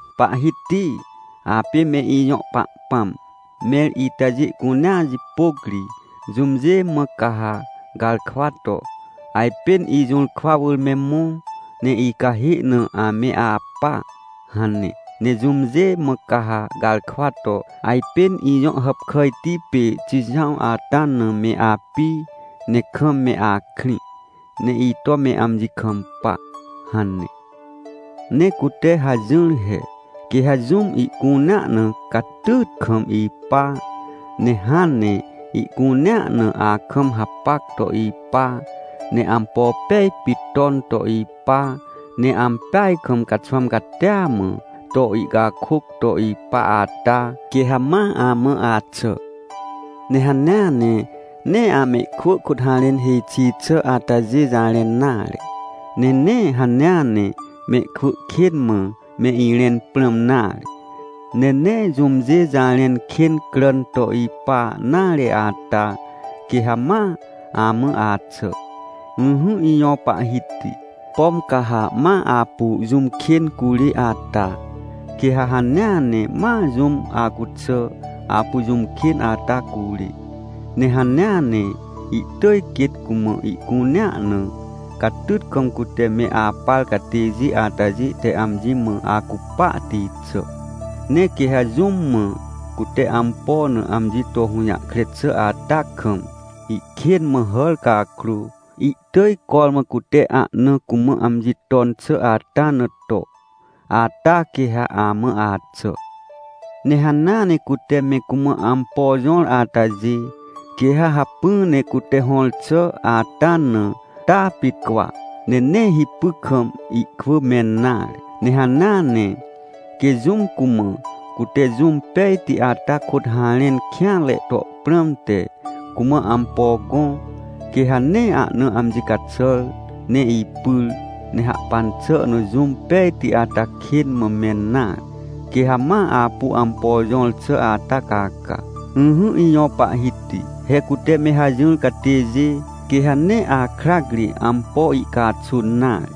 Pahhiti, apê me ijõ Pahpãm! Mẽr itajê cunea jipôc ri, jũmjê mã ca ha garkwa to: “Ajpên ijũrkwa wỳr me mõ, ne icahê na ame apa”? hane. Ne jũmjê mã ca ha garkwa to: “Ajpên ijõ hàpkàjti pê Xijãw ata na me api, ne kam me akrĩ, ne ito me amji kampa”? hane. Ne cute hajỹr he, quê ha jũm ihcunea na catyyt kam ipa, ne hãn ne ihcunea na akam hapac to ipa, ne ampo pej pit ton to ipa, ne ampeaj kam caxwãm catia mã, to ihcakôc to ipa ata, quê ha ma amã axà. Ne hanea ne nee amehkwỳ kôt harẽn hêj xi xà atajê jarẽn nare, ne nee hanea ne mehkwỳ kên mã me irẽn prãm nare, ne nee jũmjê jarẽn kên cràn to ipa nare ata, quê ha ma amã axà. Ỹhỹ ijõ Pahhiti, pom ca ha ma apu jũm kên curê ata, quê ha hanea ne ma jũm acuxà, apu jũm kên ata curê. Ne hanea ne, ihtỳj quêt cumã ihcunea na, catyt kam cute me apar catêjê atajê te amji mã acupahti xà. Ne quê ha jũm mã cute ampo na, amji to hũjahkre xà ata kam, ihkên mã hàr cakrô, ihtỳj cormã cute ahna cumã amji ton xà ata na to, ata quê ha amã axà. Ne hanea ne cute me cumã ampo jõr atajê, quê ha hacpỹ ne cute hõr xà ata na, taa pit cwa, ne nee hipy kam ihkwỳ mẽn nare. Ne hanea ne, quê jũm cumã, cute jũm pejti ata kôt harẽn kêanre to prãmte, cumã ampo gõ, quê ha nee ahna amji caxàr ne ipyr, ne hahpan xà na jũm pejti ata kên mã mẽn nare. Quê ha ma apu ampo jõr xà ata caca. Ỹhỹ ijõ Pahhiti, he cute me hajỹr catêjê, quê ha nee akrac ri ampo ihcaxun nare.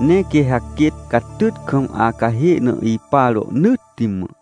Ne quê ha quêt catyt kam acahê na ipa rohnỳtti mã.